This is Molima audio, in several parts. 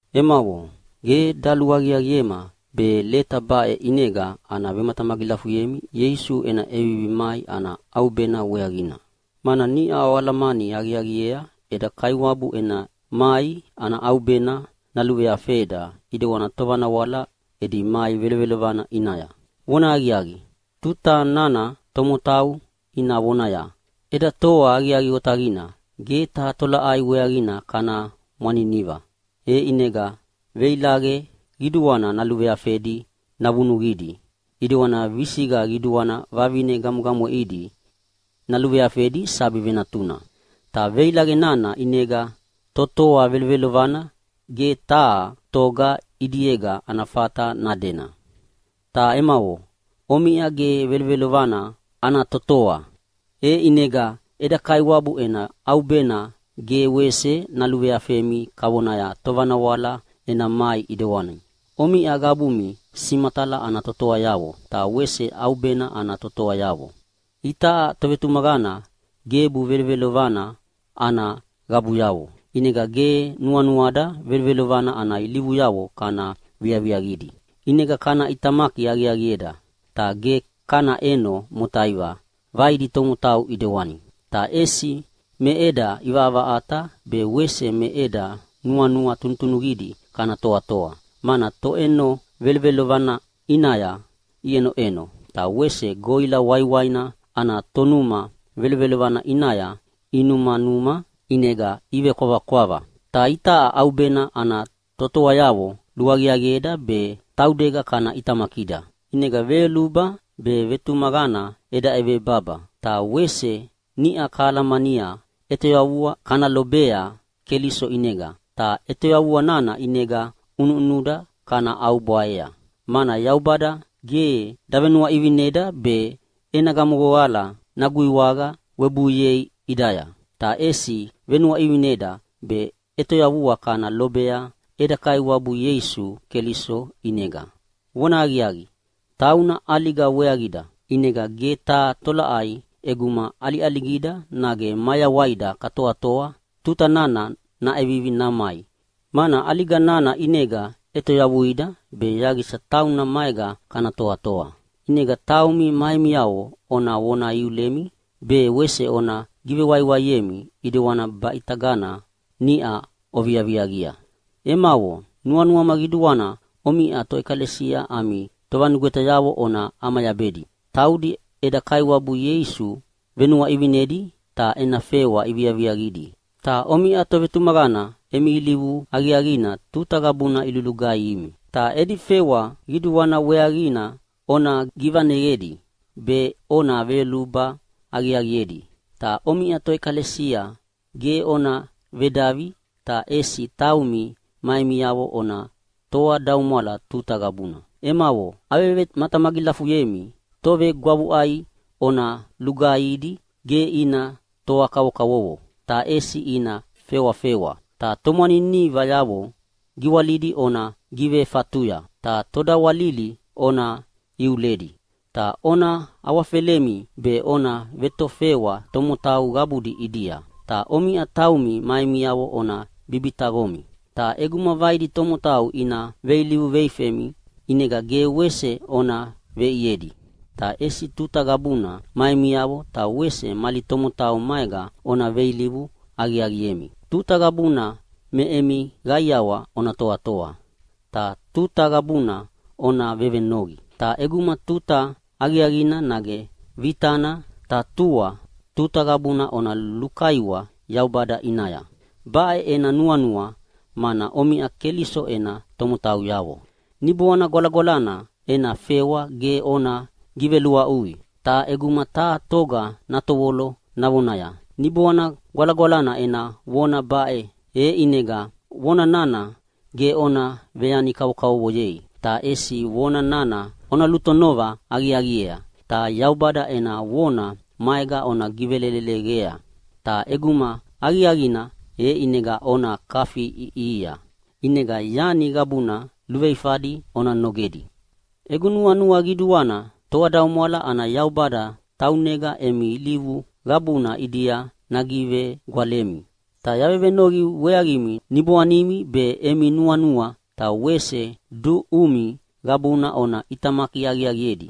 Emavo, ge daluaqiaqiema be leta baʼe ʼinega ana vematamagilafuyemi Ieisu ena ʼevivi mai ana ʼaubena weaqina, mana niʼa oalamani aqiaqiea eda Kaiwabu ena mai ana ʼaubena naluveafeda ʼidewani tovanawala edi mai velovelovana ʼinaya. Vonahaqiaqi, tuta nana tomotau ina vonaya, “Eda toa aqiaqi otaqina, ge taha tolaʼai weaqina kana mwaniniva.” E ʼinega veilaqe qiduana naluveafedi navunuqidi ʼidewani visiqa qiduana vavine gamwegamweʼidi naluveafedi sabi venatuna. Ta veilaqe nana ʼinega totoa velovelovana ge taha toga ʼidiega ana fata nadena. Ta emavo, omiʼa ge velovelovana ana totoa, e ʼinega eda Kaiwabu ena ʼaubena ge wese naluveafemi kavona tovanawala ena mai ʼidewani. Omiʼa qabumi simatala ana totoayavo ta wese ʼaubena ana totoayavo. Itaʼa tovetumaqana gebu velovelovana ana qabuyavo, ʼinega ge nuanuada velovelovana ana ilivuyavo kana viaviaqidi. ʼInega kana ʼitamaki aqiaqieda, ta ge kana ʼeno motaiva vaidi tomotau ʼidewani. Ta ʼesi me eda ʼivaʼavaʼata be wese me eda nuanua tunutunuqidi kana toatoa, mana toʼeno velovelovana ʼinaya iʼenoʼeno, ta wese goʼila waiwaina ana tonuma velovelovana ʼinaya inumanuma ʼinega ivekwavakwava. Ta itaʼa ʼaubena ana totoayavo luaqiaqieda be taudega kana ʼitamakida. ʼInega veyoluba be vetumaqana eda ʼebevebaba, ta wese niʼa kalamania ʼetoyavua kana lobea Keliso ʼinega, ta ʼetoyavua nana ʼinega ʼunuʼunuda kana ʼaubwaea. Mana Yaubada ge davenuaʼivinida be ena gamohoqala naguiwaqa webuiei ʼidaya, ta ʼesi venuaʼivineda be ʼetoyavua kana lobea eda Kaiwabu Ieisu Keliso ʼinega. Vonahaqiaqi, tauna ʼaliga weaqida, ʼinega ge taha tolaʼai ʼeguma ʼaliʼaligida nage mayawaida katoatoa tuta nana naʼevivi namai, mana ʼaliga nana ʼinega ʼetoyavuida be yaqisa tauna maega kana toatoa. ʼInega taumi ma emiavo ona vona iulemi be wese ona givewaiwaiemi, ʼidewani baʼitagana niʼa oviaviaqia. Emavo, nuanuama qiduana omiʼa toʼekalesia ami tovanugwetayavo ona ʼamayabedi. Taudi eda Kaiwabu Ieisu venuaʼivinidi ta ena fewa iviaviaqidi, ta omiʼa tovetumaqana emi ilivu aqiaqina tuta qabuna ilulugaihimi. Ta edi fewa qiduana weaqina ona givaneyedi be ona veyoluba aqiaqiedi. Ta omiʼa toʼekalesia ge ona vedavi, ta ʼesi taumi ma emiavo ona toadaumwala tuta qabuna. Emavo, avevematamagilafuyemi tovegwavuʼai ona lugaihidi ge ina toa kavokavovo, ta ʼesi ina fewafewa, ta tomwaninivayavo giwalidi ona givefatuya, ta todawalili ona iuledi. Ta ona awafelemi be ona vetofewa tomotau qabudi ʼidia. Ta omiʼa taumi ma emiavo ona bibitaqomi. Ta ʼeguma vaidi tomotau ina veilivu veifemi ʼinega ge wese ona veʼiedi, ta ʼesi tuta qabuna ma emiavo ta wese mali tomotau maega ona veilivu aqiaqiemi. Tuta qabuna me emi qaiawa ona toatoa. Ta tuta qabuna ona vevenoqi! Ta ʼeguma tuta aqiaqina nage vitana, ta tua tuta qabuna ona lukaiwa Yaubada ʼinaya. Baʼe ena nuanua, mana omiʼa Keliso ena tomotauyavo. Niboana Gwalagwalana ena fewa ge ona giveluaʼui. Ta ʼeguma taha toga natovolo navonaya, “Niboana Gwalagwalana ena vona baʼe.” E ʼinega vona nana ge ona veyani kavokavovoyei, ta ʼesi vona nana ona lutonova aqiaqiea ta Yaubada ena vona maega ona giveleleqea, ta ʼeguma aqiaqina e ʼinega ona kafiʼiʼihia. ʼInega yani qabuna luveifadi ona nogedi. Egu nuanua qiduana toadaumwala ana Yaubada taunega emi ilivu qabuna ʼidia nagivegwalemi. Ta yavevenoqi weaqimi niboanimi be emi nuanua ta wese duʼumi qabuna ona ʼitamaki aqiaqiedi,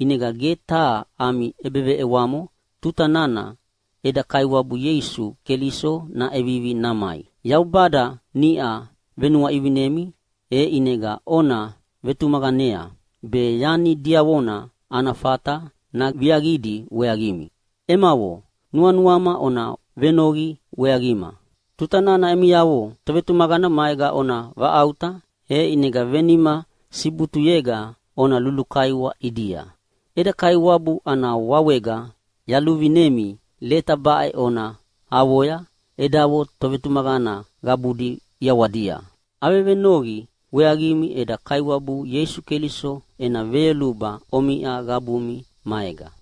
ʼinega ge taha ami ʼebeveʼewamo tuta nana eda Kaiwabu Ieisu Keliso naʼevivi namai. Yaubada niʼa venuaʼivinimi, e ʼinega ona vetumaqanea be yani diavona ana fata naviaqidi weaqimi. Emavo, nuanuama ona venoqi weaqima. Tuta nana emiavo tovetumaqana maega ona vaʼauta e ʼinega venima sibutuyega ona lulukaiwa ʼidia. Eda Kaiwabu ana wawega yaluvinemi leta baʼe ona avoya edavo tovetumaqana qabudi ʼiawadia. Avevenoqi weaqimi eda Kaiwabu Ieisu Keliso ena veyoluba omiʼa qabumi maega.